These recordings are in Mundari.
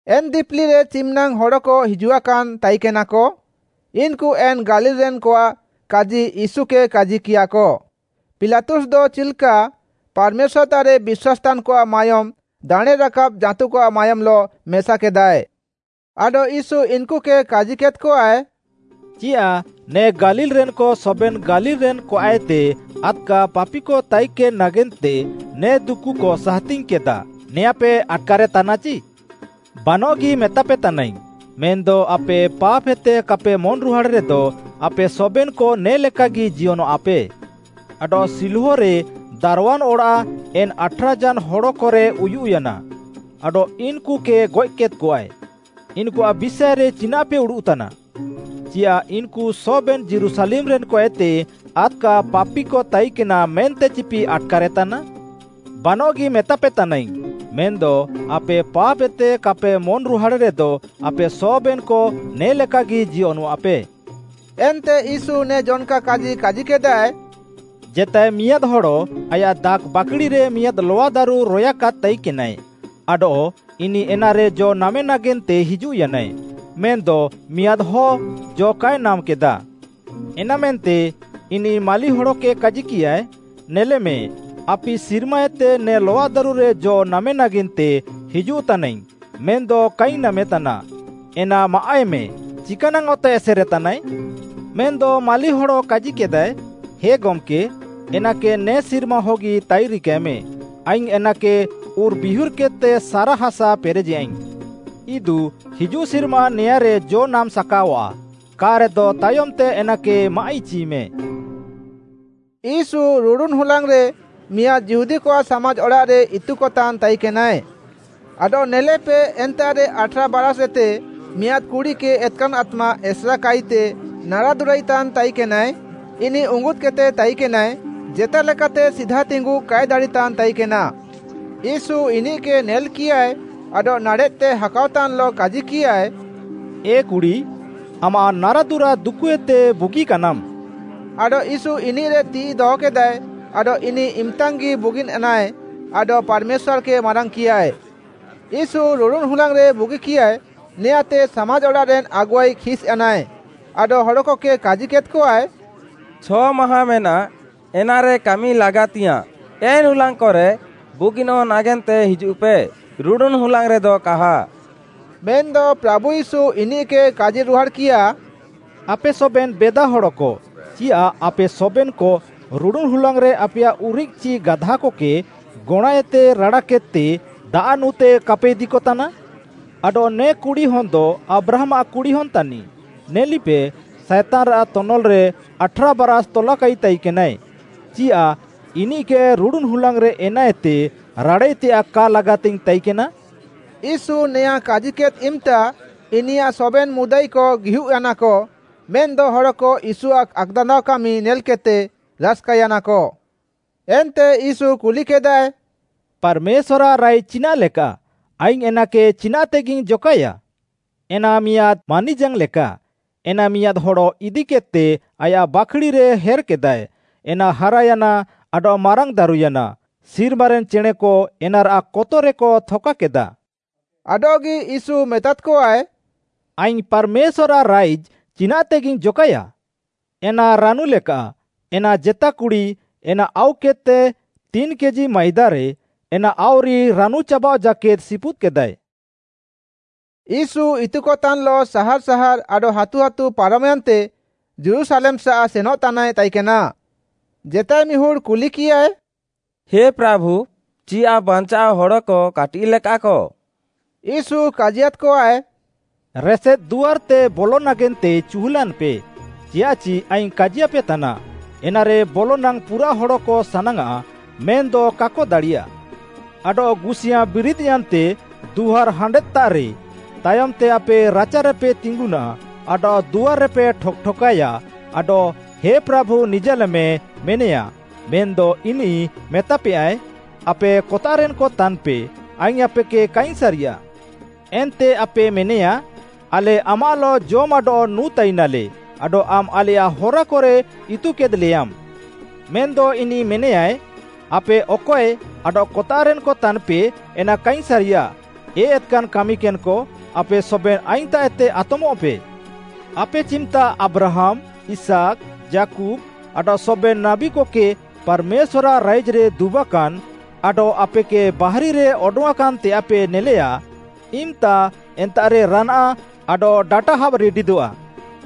ଏନ୍‌ ଦିପିଲିରେ ଚିମ୍‌ନାଙ୍ଗ୍‌ ହଡ଼କ ହିଜୁଆକାନ୍‌ ତାଇକେନାକ, ଇନ୍‌କୁ ଏନ୍‌ ଗାଲିଲ୍‌ରେନ୍‌କଆଃ କାଜି ୟୀଶୁକେ କାଜିକିୟାକ, ପିଲାତୁସ୍ଦ ଚିଲ୍‌କା ପାର୍‌ମେଶ୍ୱାର୍‌ତାଃରେ ବିଶ୍ୱାସ୍‌ ତାନ୍‌କଆଃ ମାୟୋମ୍‌ ଦାଣେଁରାକାବ୍‌ ଜାଁତୁକଆଃ ମାୟୋମ୍‌ଲଃ ମେସାକେଦାଏ। ଆଡଃ ୟୀଶୁ ଇନ୍‌କୁକେ କାଜିକେଦ୍‌କଆଏ, “ଚିୟାଃ ନେ ଗାଲିଲ୍‌ରେନ୍‌କ ସବେନ୍‌ ଗାଲିଲ୍‌ରେନ୍‌ କଆଃଏତେ ଆଦ୍‌କା ପାପିକ ତାଇକେନ୍‌ ନାଗେନ୍ତେ ନେ ଦୁକୁକ ସାହାତିଙ୍ଗ୍‌କେଦାଃ, ନେଆଁଁପେ ଆଟ୍‌କାରେ ତାନାଚି? ବାନଃଗି ମେତାପେତାନାଇଙ୍ଗ୍‌, ମେନ୍‌ଦ ଆପେ ପାପ୍‌ହେତେ କାପେ ମନ୍‌ରୁହାଡ଼୍‌ ରେଦ ଆପେ ସବେନ୍‌କ ନେ ଲେକାଗି ଜିୟନଃଆପେ। ଆଡଃ ଶିଲୋହରେ ଦାର୍‌ୱାନ୍‌ ଅଡ଼ାଃ ଏନ୍‌ ଆଠ୍‌ରା ଝାନ୍‌ ହଡ଼କରେ ଉୟୁଃୟାନା ଆଡଃ ଇନ୍‌କୁକେ ଗଏଃକେଦ୍‌କଆଏ, ଇନ୍‌କୁଆଃ ବିଷାଏରେ ଚିନାଃପେ ଉଡ଼ୁଃତାନା? ଚିୟାଃ ଇନ୍‌କୁ ସବେନ୍‌ ଯୀରୁଶାଲେମ୍‌ରେନ୍‌କଏତେ ଆଦ୍‌କା ପାପିକ ତାଇକେନା ମେନ୍ତେଚିପେ ଆଟ୍‌କାରେ ତାନା? ବାନଃଗି ମେତାପେ ତାନାଇଙ୍ଗ୍‌, ମେନ୍‌ଦ ଆପେ ପାପ୍‌ହେତେ କାପେ ମନ୍‌ରୁହାଡ଼େରେଦ ଆପେ ସବେନ୍‌କ ନେ ଲେକାଗି ଜିୟନଃଆପେ।” ଏନ୍ତେ ୟୀଶୁ ନେ ଜନ୍‌କା କାଜି କାଜିକେଦାଏ, “ଜେତାଏ ମିଆଁଦ୍‌ହଡ଼ ଆୟାଃ ଦାଖ୍‌ବାକ୍‌ଡ଼ିରେ ମିଆଁଦ୍‌ ଲଆଦାରୁ ରୟାକାଦ୍‌ ତାଇକେନାଏ, ଆଡଃ ଇନିଃ ଏନାରେ ଜ ନାମେନାଗେନ୍ତେ ହିଜୁଃୟାନାଏ, ମେନ୍‌ଦ ମିଆଁଦ୍‌ ହ ଜ କାଏ ନାମ୍‌କେଦାଃ। ଏନାମେନ୍ତେ ଇନିଃ ମାଳିହଡ଼କେ କାଜିକିୟାଏ, ‘ନେଲେମେ ଆପି ସିର୍ମାଏତେ ନେ ଲଆଦାରୁରେ ଜ ନାମେନାଗେନ୍ତେ ହିଜୁଃତାନାଇଙ୍ଗ୍‌ ମେନ୍‌ଦ କାଇଙ୍ଗ୍‌ ନାମେତାନା, ଏନା ମାଏଃମେ, ଚିକାନାଙ୍ଗ୍‌ ଅତେ ଏସେରେତାନାଏ?’ ମେନ୍‌ଦ ମାଳିହଡ଼ କାଜିକେଦାଏ, ‘ହେ ଗମ୍‌କେ, ଏନାକେ ନେ ସିର୍ମାହଗି ତାଇରିକାଏମେଁ, ଆଇଙ୍ଗ୍‌ ଏନାକେ ଉର୍‌ବିହୁର୍‌କେଦ୍‌ତେ ସାରାହାସା ପେରେଜେୟାଇଙ୍ଗ୍‌। ଇଦୁ ହିଜୁଃସିର୍ମା ନେଆଁଁରେ ଜ ନାମ୍‌ ସାକାଅଆଃ, କା'ରେଦ ତାୟମ୍‌ତେ ଏନାକେ ମାଆଃଇଚିମେ।’” ୟୀଶୁ ରୁଡ଼ୁନ୍‌ ହୁଲାଙ୍ଗ୍‌ରେ ମିଆଁଦ୍‌ ଯିହୁଦୀକଆଃ ସାମାଜ୍‌ ଅଡ଼ାଃରେ ଇତୁକତାନ୍‌ ତାଇକେନାଏ। ଆଡଃ ନେଲେପେ ଏନ୍ତାଃରେ ଆଠ୍‌ରା ବାରାଷ୍‌ଏତେ ମିଆଁଦ୍‌ କୁଡ଼ିକେ ଏତ୍‌କାନ୍‌ ଆତ୍ମା ଏସେରାକାଇତେ ନାରାଦୁରାଇତାନ୍‌ ତାଇକେନାଏ, ଇନିଃ ଉଙ୍ଗୁଦ୍‌କେଦ୍‌ତେ ତାଇକେନାଏ, ଜେତାଲେକାତେ ସିଧାତିଙ୍ଗୁଃ କାଏ ଦାଡ଼ିତାନ୍‌ ତାଇକେନା। ୟୀଶୁ ଇନିଃକେ ନେଲ୍‌କିୟାଏ ଆଡଃ ନାଡ଼େଃତେ ହାକାଅତାନ୍‌ଲଃ କାଜିକିୟାଏ, “ଏ କୁଡ଼ି, ଆମାଃ ନାରାଦୁରା ଦୁକୁଏତେ ବୁଗିକାନାମ୍‌।” ଆଡଃ ୟୀଶୁ ଇନିଃରେ ତିଃଇ ଦହକେଦାଏ ଆଡଃ ଇନିଃ ଇମ୍‌ତାଙ୍ଗ୍‌ଗି ବୁଗିନ୍‌ୟାନାଏ, ଆଡଃ ପାର୍‌ମେଶ୍ୱାର୍‌କେ ମାରାଙ୍ଗ୍‌କିୟାଏ। ୟୀଶୁ ରୁଡ଼ୁନ୍‌ ହୁଲାଙ୍ଗ୍‌ରେ ବୁଗିକିୟାଏ ନେଆଁଁତେ ସାମାଜ୍‌ଅଡ଼ାଃରେନ୍‌ ଆଗୁଆଇ ଖିସ୍‌ୟାନାଏ, ଆଡଃ ହଡ଼କକେ କାଜିକେଦ୍‌କଆଏ, “ଛ'ମାହାଁ ମେନାଃ ଏନାରେ କାମି ଲାଗାତିଙ୍ଗ୍‌ୟାଁଃ, ଏନ୍‌ ହୁଲାଙ୍ଗ୍‌କରେ ବୁଗିନଃ ନାଗେନ୍ତେ ହିଜୁଃପେ, ରୁଡ଼ୁନ୍‌ ହୁଲାଙ୍ଗ୍‌ରେଦ କାହା।” ମେନ୍‌ଦ ପ୍ରାଭୁ ୟୀଶୁ ଇନିଃକେ କାଜିରୁହାଡ଼୍‌କିୟା, “ଆପେ ସବେନ୍‌ ବେଦାହଡ଼କ, ଚିୟାଃ ଆପେ ସବେନ୍‌କ ରୁଡ଼ୁନ୍‌ ହୁଲାଙ୍ଗ୍‌ରେ ଆପେୟାଃ ଉରିଃକ୍‌ ଚି ଗାଧାକକେ ଗଣାଁଏତେ ରାଡ଼ାକେଦ୍‌ତେ ଦାଆଃ ନୁଁ ତେ କାପେ ଇଦିକତାନା? ଆଡଃ ନେ କୁଡ଼ିହନ୍‌ଦ ଆବ୍ରାହାମ୍‌ଆଃ କୁଡ଼ିହନ୍‌ ତାନିଃ, ନେଲିପେ ଇନିଃ ସାଏତାନ୍‌ରାଃ ତନଲ୍‌ରେ ଆଠ୍‌ରା ବାରାଷ୍‌ ତଲାକାଇତାଇନାଏ, ଚିୟାଃ ଇନିଃକେ ରୁଡ଼ୁନ୍‌ ହୁଲାଙ୍ଗ୍‌ରେ ଏନାଏତେ ରାଡ଼ାଇତେୟାଃ କା ଲାଗାତିଙ୍ଗ୍‌ ତାଇକେନା?” ୟୀଶୁ ନେଆଁଁ କାଜିକେଦ୍‌ ଇମ୍‌ତା, ଇନିୟାଃ ସବେନ୍‌ ମୁଦାଇକ ଗିହୁଃୟାନାକ ମେନ୍‌ଦ ହଡ଼କ ୟୀଶୁଆଃ ଆକ୍‌ଦାନ୍ଦାଅକାମି ନେଲ୍‌କେଦ୍‌ତେ ରାସ୍‌କାୟାନାକ। ଏନ୍ତେ ୟୀଶୁ କୁଲିକେଦାଏ, “ପାର୍‌ମେଶ୍ୱାର୍‌ଆଃ ରାଇଜ୍‌ ଚିନାଃ ଲେକା? ଆଇଙ୍ଗ୍‌ ଏନାକେ ଚିନାଃତେଗିଇଙ୍ଗ୍‌ ଜକାଏୟା? ଏନା ମିଆଁଦ୍‌ ମାନିଜାଙ୍ଗ୍‌ଲେକା, ଏନା ମିଆଁଦ୍‌ ହଡ଼ ଇଦିକେଦ୍‌ତେ ଆୟାଃ ବାଖ୍‌ଡ଼ିରେ ହେର୍‌କେଦାଏ, ଏନା ହାରାୟାନା ଆଡଃ ମାରାଙ୍ଗ୍‌ ଦାରୁୟାନା, ସିର୍ମାରେନ୍‌ ଚେଣେଁକ ଏନାରାଃ କତକରେକ ଥକାକେଦା।” ଆଡଃଗି ୟୀଶୁ ମେତାଦ୍‌କଆଏ, “ଆଇଙ୍ଗ୍‌ ପାର୍‌ମେଶ୍ୱାର୍‌ଆଃ ରାଇଜ୍‌ ଚିନାଃତେଗିଇଙ୍ଗ୍‌ ଜକାଏୟା? ଏନା ରାନୁ ଲେକାଃ, ଏନା ଜେତା କୁଡ଼ି ଏନା ଆଉକେଦ୍‌ତେ ତିନ୍‌ କେଜି ମାଇଦାରେ ଏନା ଆଉରି ରାନୁଚାବାଅଃ ଜାକେଦ୍‌ ସିପୁଦ୍‌କେଦାଏ।” ୟୀଶୁ ଇତୁକତାନ୍‌ଲଃ ସାହାର୍‌ ସାହାର୍‌ ଆଡଃ ହାତୁ ହାତୁ ପାରମ୍‌ୟାନ୍ତେ ଯୀରୁଶାଲେମ୍‌ସାଃ ସେନଃତାନାଏ ତାଇକେନା। ଜେତାଏମିହୁଡ଼୍‌ କୁଲିକିୟାଏ, “ହେ ପ୍ରାଭୁ ଚିୟାଃ ବାଞ୍ଚାଅଃ ହଡ଼କ କାଟିଃଲେକାଃକ?” ୟୀଶୁ କାଜିୟାଦ୍‌କଆଏ, “ରେସେଦ୍‌ ଦୁଆର୍‌ତେ ବଲଃନାଗେନ୍ତେ ଚିହୁଲାନ୍‌ପେ, ଚିୟାଃଚି ଆଇଙ୍ଗ୍‌ କାଜିୟାପେତାନା, ଏନାରେ ବଲନାଙ୍ଗ୍‌ ପୁରାଃ ହଡ଼କ ସାନାଙ୍ଗ୍‌ଆଃ ମେନ୍‌ଦ କାକ ଦାଡ଼ିୟାଃ। ଆଡଃ ଗୁସିୟାଁ ବିରିଦ୍‌ୟାନ୍ତେ ଦୁଆର୍‌ ହାଣ୍ଡେଦ୍‌ତାରେ, ତାୟମ୍‌ତେ ଆପେ ରାଚାରେପେ ତିଙ୍ଗୁନାଃ ଆଡଃ ଦୁଆର୍‌ରେପେ ଠକ୍‌ଠକାଏୟା ଆଡଃ ‘ହେ ପ୍ରାଭୁ ନିଜାଲେମ୍‌’ ମେନେୟା, ମେନ୍‌ଦ ଇନିଃ ମେତାପେୟାଏ, ‘ଆପେ କତାଃରେନ୍‌କ ତାନ୍‌ପେ ଆଇଙ୍ଗ୍‌ ଆପେକେ କାଇଙ୍ଗ୍‌ ସାରିୟାଃ।’ ଏନ୍ତେ ଆପେ ମେନେୟା, ଆଲେ ଆମାଃଲଃ ଜମ୍‌ ଆଡଃ ନୁଁ ତାଇନାଲେ ଆଡଃ ଆମ୍‌ ଆଲେୟାଃ ହରାକରେ ଇତୁକେଦ୍‌ଲେୟାମ୍। ମେନ୍‌ଦ ଇନିଃ ମେନେୟାଏ, ‘ଆପେ ଅକଏ ଆଡଃ କତାଃରେନ୍‌କ ତାନ୍‌ପେ ଏନା କାଇଙ୍ଗ୍‌ ସାରିୟାଃ, ଏ ଏତ୍‌କାନ୍‌ କାମିକେନ୍‌କ, ଆପେ ସବେନ୍‌ ଆଇଙ୍ଗ୍‌ତାଃଏତେ ଆତମଃପେ। ଆପେ ଚିମ୍‌ତା ଆବ୍ରାହାମ୍‌, ଇସାକ୍‌, ଯାକୁବ୍‌ ଆଡଃ ସବେନ୍‌ ନାବୀକକେ ପାର୍‌ମେଶ୍ୱାର୍‌ଆଃ ରାଇଜ୍‌ରେ ଦୁବାକାନ୍‌ ଆଡଃ ଆପେକେ ବାହାରିରେ ଅଡଙ୍ଗ୍‌ଆଁକାନ୍‌ ତେୟାଃପେ ନେଲେୟା। ଇମ୍‌ତା ଏନ୍ତାଃରେ ରାନାଆଃ ଆଡଃ ଡାଟା ହାବ୍‌ ରିଡିଦଃଆ,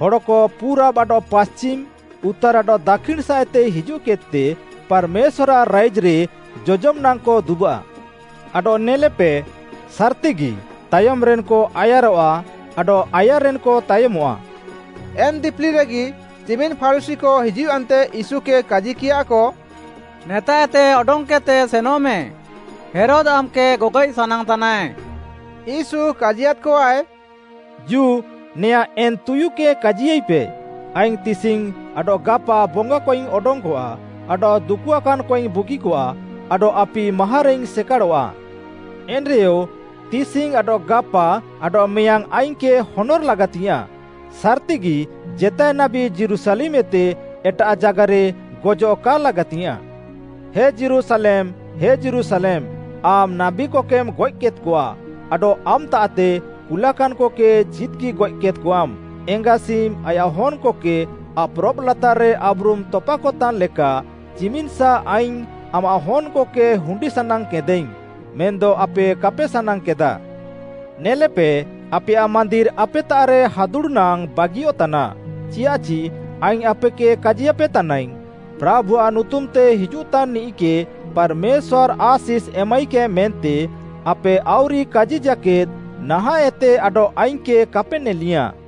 ହଡ଼କ ପୁରାବ୍‌ ଆଡଃ ପାଶ୍ଚିମ୍‌, ଉତ୍ତାର୍‌ ଆଡଃ ଦାକ୍ଷିଣ୍‌ସାଃଏତେ ହିଜୁଃକେଦ୍‌ତେ ପାର୍‌ମେଶ୍ୱାର୍‌ଆଃ ରାଇଜ୍‌ରେ ଜଜମ୍‌ ନାଙ୍ଗ୍‌କ ଦୁବାଃ। ଆଡଃ ନେଲେପେ, ସାର୍‌ତିଗି, ତାୟମ୍‌ରେନ୍‌କ ଆୟାରଃଆ ଆଡଃ ଆୟାର୍‌ରେନ୍‌କ ତାୟମଃଆ।’” ଏନ୍‌ ଦିପିଲିରେଗି ଚିମିନ୍‌ ଫାରୁଶୀକ ହିଜୁଃୟାନ୍ତେ ୟୀଶୁକେ କାଜିକିୟାଃକ, “ନେତାଃଏତେ ଅଡଙ୍ଗ୍‌କେଦ୍‌ତେ ସେନଃମେ, ହେରୋଦ୍‌ ଆମ୍‌କେ ଗଗଏଃ ସାନାଙ୍ଗ୍‌ତାନାଏ।” ୟୀଶୁ କାଜିୟାଦ୍‌କଆଏ, “ଜୁ ନେଆଁଁ ଏନ୍‌ ତୁୟୁକେ କାଜିୟାଇପେ, ‘ଆଇଙ୍ଗ୍‌ ତିସିଙ୍ଗ୍‌ ଆଡଃ ଗାପା ବଙ୍ଗାକଇଙ୍ଗ୍‌ ଅଡଙ୍ଗ୍‌କଆ ଆଡଃ ଦୁକୁଆକାନ୍‌କଇଙ୍ଗ୍‌ ବୁଗିକଆ ଆଡଃ ଆପି ମାହାଁରେଇଙ୍ଗ୍‌ ସେକାଡ଼ଃଆ।’ ଏନ୍‌ରେୟ ତିସିଙ୍ଗ୍‌ ଆଡଃ ଗାପା ଆଡଃ ମେୟାଙ୍ଗ୍‌ ଆଇଙ୍ଗ୍‌କେ ହନର୍‌ ଲାଗାତିଙ୍ଗ୍‌ୟାଁଃ, ସାର୍‌ତିଗି ଜେତାଏ ନାବୀ ଯୀରୁଶାଲେମ୍‌ ଏତେ ଏଟାଃ ଜାଗାରେ ଗଜଃ କା ଲାଗାତିଙ୍ଗ୍‌ୟାଁଃ। “ହେ ଯୀରୁଶାଲେମ୍‌, ହେ ଯୀରୁଶାଲେମ୍‌ ଆମ୍‌ ନାବୀକକେମ୍‌ ଗଏଃକେଦ୍‌କଆ ଆଡଃ ଆମ୍‌ତାଃତେ କୁଲାକାନ୍‌କକେ ଚିଦ୍‌ଗିଗଏଃ କେଦ୍‌କଆମ୍‌, ଏଙ୍ଗାସିମ୍‌ ଆୟାଃ ହନ୍‌କକେ ଆପ୍‌ରବ୍‌ ଲାତାର୍‌ରେ ଆବ୍‌ରୁମ୍‌ ତପାକତାନ୍‌ଲେକା ଚିମିନ୍‌ସା ଆଇଙ୍ଗ୍‌ ଆମାଃ ହନ୍‌କକେ ହୁଣ୍ଡିସାନାଙ୍ଗ୍‌କେଦାଇଙ୍ଗ୍‌, ମେନ୍‌ଦ ଆପେ କାପେ ସାନାଙ୍ଗ୍‌କେଦାଃ। ନେଲେପେ, ଆପେୟାଃ ମାନ୍ଦିର୍‌ ଆପେତାଃରେ ହାଦୁଡ଼୍‌ନାଙ୍ଗ୍‌ ବାଗିୟଃତାନା। ଚିୟାଃଚି ଆଇଙ୍ଗ୍‌ ଆପେକେ କାଜିୟାପେ ତାନାଇଙ୍ଗ୍‌, ‘ପ୍ରାଭୁଆଃ ନୁତୁମ୍‌ତେ ହିଜୁଃତାନ୍‌ନିଃକେ ପାର୍‌ମେଶ୍ୱାର୍‌ ଆଶିଷ୍‌ ଏମାଇକାଏ ମେନ୍ତେ ଆପେ ଆଉରି କାଜି ଜାକେଦ୍‌ ନାହାଁଃଏତେ ଆଡଃ ଆଇଙ୍ଗ୍‌କେ କାପେ ନେଲିୟାଁଃ।’”